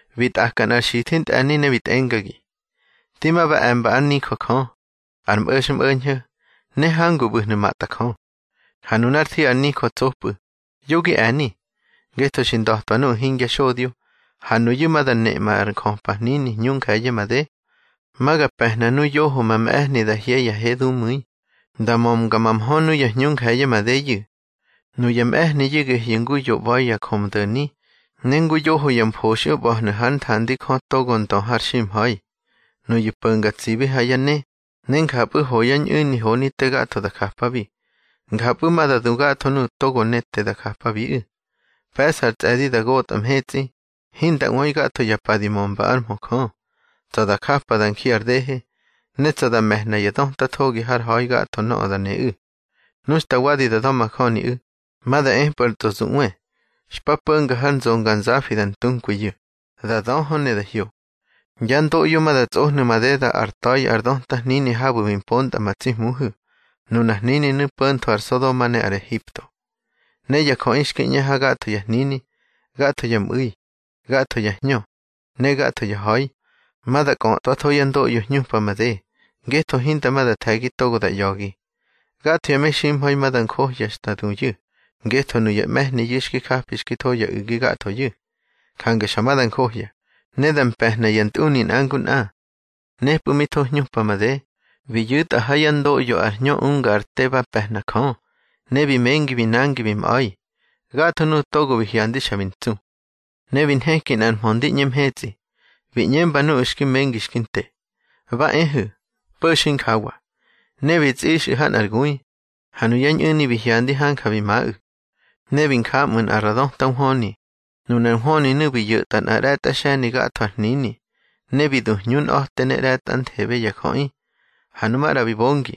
Bi tꞌaka nꞌar xithi ntꞌe̱ni ne bi tꞌengagi: —Di ma ba e̱mba ár nijö Jö, ar mꞌo̱xmꞌo̱ñho̱, ne hangu ꞌbu̱hnu̱ matꞌa Jö. Ha nunár thi ar nijö tsopꞌu̱, yo gi e̱ni, ngetho xi nda̱twa nuꞌu̱ hingya xodyo, ha nuyu̱ ma da neꞌma ar njöpa hnini hñu nje̱ye̱ made. Ma ga pe̱hna nu yoho ma mꞌe̱hni da hye ya he dumu̱i, da mömga ma mhö nuya hñu nje̱ye̱ madeyu̱. Nuya mꞌe̱hniyu̱ gehyu̱ ngu yo ꞌba̱i ya njömdo̱ni, ne ngu yoho ya mfoxꞌyo ꞌba̱hnu̱ hár nthandi Jö togo ár ndö ar ximha̱i. Nuyu̱ po̱ngar tsibi ha yá ne, ne njapꞌu̱ ho yá ñꞌu̱ni honi te gatho da japabi. Njapꞌu̱ ma da du gatho nuꞌu̱ togo ne te da japabiꞌu̱. Pe̱ꞌsa ar tsꞌe̱di da gotꞌa mhetsꞌi, hinda ꞌwöi gatho ya pa di mömba ár mhö Jö. Tsa̱ da japa da nji ar dehe, ne tsa̱ da me̱hna ya döta thogi har ha̱i gatho nöꞌö da neꞌu̱. Nu xta wadi da da̱majöniꞌu̱, ma da epꞌu̱ ar tsꞌozuꞌwe, xpa po̱xa har nzonganzafi da ntunkwiyu̱, da döhö ne da hyo. Yá ndoꞌyo ma da tsꞌohnu̱ madeda ár ta̱i ar döta hnini habu̱ bi mpontꞌa ma tsi Hmuhu̱. Nunar hnininu̱ po̱ntho ar Sodoma ne ar Ehipto. Ne ya jöꞌi xki ꞌñe ha gatho ya hnini, gatho ya mꞌu̱i, gatho ya hñö, ne gatho ya ha̱i, ma da kꞌötꞌwatho yá ndoꞌyo hñupa made, ngetho hinda ma da the̱gi togo da ꞌya̱gi. Gatho ya meximha̱i ma da njohya xta duyu̱, ngetho nuya mꞌe̱hniyu̱ xki japi xki tho ya u̱gi gathoyu̱. Jange xa ma da njohya, ne da mpe̱hna ya ntꞌuni nꞌa ngu nꞌa. Nepu̱ mi tho hñupa made, bi yu̱tꞌa ha yá ndoꞌyo ar hñö unga ar te ba pe̱hna Jö, ne bi mengi bi nangi bi mꞌa̱i. Gatho nuꞌu̱ togo bi hyandi xa bi ntsu. Ne bi nheki nꞌar mhö ndi ꞌñe mhetsꞌi, bi ꞌñemba nuꞌu̱ xki mengi xki nte: —Ba ehu̱, po̱xu̱ injawa. Ne bi tsꞌixꞌu̱ ha nꞌar gui. Ha nuyá ñꞌu̱ni bi hyandi hanja bi maꞌu̱. Ne bi nja ꞌmu̱ nꞌa ra döta nhwöni. Nunar nhwöninu̱ bi yo̱tꞌa nꞌa ꞌre̱tꞌa xe̱ni gatho ar hnini, ne bi du hñunꞌa̱te ne ꞌre̱tꞌanthebe ya jöꞌi. Ha nu maꞌra bi bongi,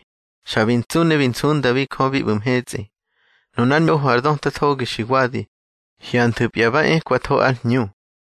xa bi ntsu ne bi nsundabi Jö bi ꞌbu̱ mhetsꞌi. Nunár ñoho ar döta thogi xi wadi. Hyanthu̱pya ba ekwatho ár hñu.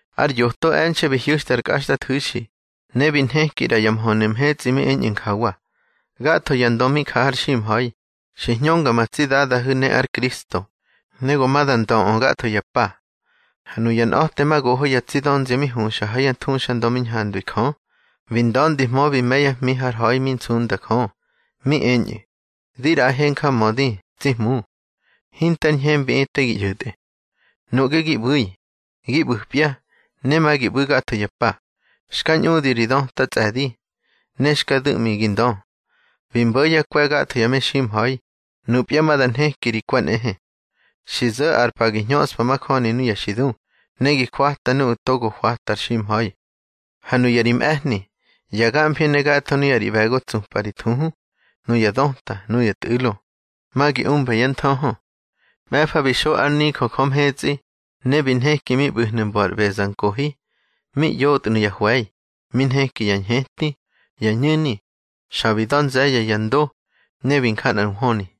Ar yoto e̱nxe̱ bi hyu̱xtꞌa ár kꞌaxtꞌathu̱xi, ne bi nheki ꞌra ya mhönu̱ mhetsꞌi mi eñꞌu̱ njawa: Gatho ya ndö mi ja har ximha̱i, xi hñönga ma tsi Dadahu̱ ne ár Kristo, ne go ma da ndöꞌö gatho ya pa. Ha nuya nꞌa̱temagoho ya tsi dönzia mi huxa ha yá thuxandö mi ñhandwi Jö, bi nda̱ndihmö bi me̱ yá hmi har ha̱i mi nsunda Jö. Mi eñꞌu̱: Di ꞌraꞌahe njamödi, tsi Hmu, hinte ar ñhembiꞌi te gi ꞌyo̱tꞌe. Nuꞌge ngi ꞌbu̱i, gi ꞌbu̱pya, ne ma gi ꞌbu̱ gatho ya pa, xka ñꞌudi ri döta tsꞌe̱di, ne xka du̱ꞌmi gi ndö. Bi mbo̱ yá kwe̱ gatho ya meximha̱i, nupya ma da nheki ri kwe̱ nꞌehe. Xi zo̱ ar pa gi hñöꞌspa majöni nuya xi du, ne gi hwata nuꞌu̱ togo hwata ar ximha̱i. Ha nuya ri mꞌe̱hni, ya gamfi ne gatho nuya ri ꞌbe̱go tsupꞌa ri thuhu, nuya döta, nuya tꞌu̱lo, ma gi umba yá nthöhö. Mꞌe̱fa bi xo ár nijö Jö mhetsꞌi, ne bi nheki mi ꞌbu̱hnu̱ mbo ar ꞌbezankohi. Mi yotnu̱ ya hwe̱i, mi nheki ya ñheti, ya ñu̱ni, xa bi da̱ nze̱ye̱ ya ndo, ne bi nja nꞌar nhwöni.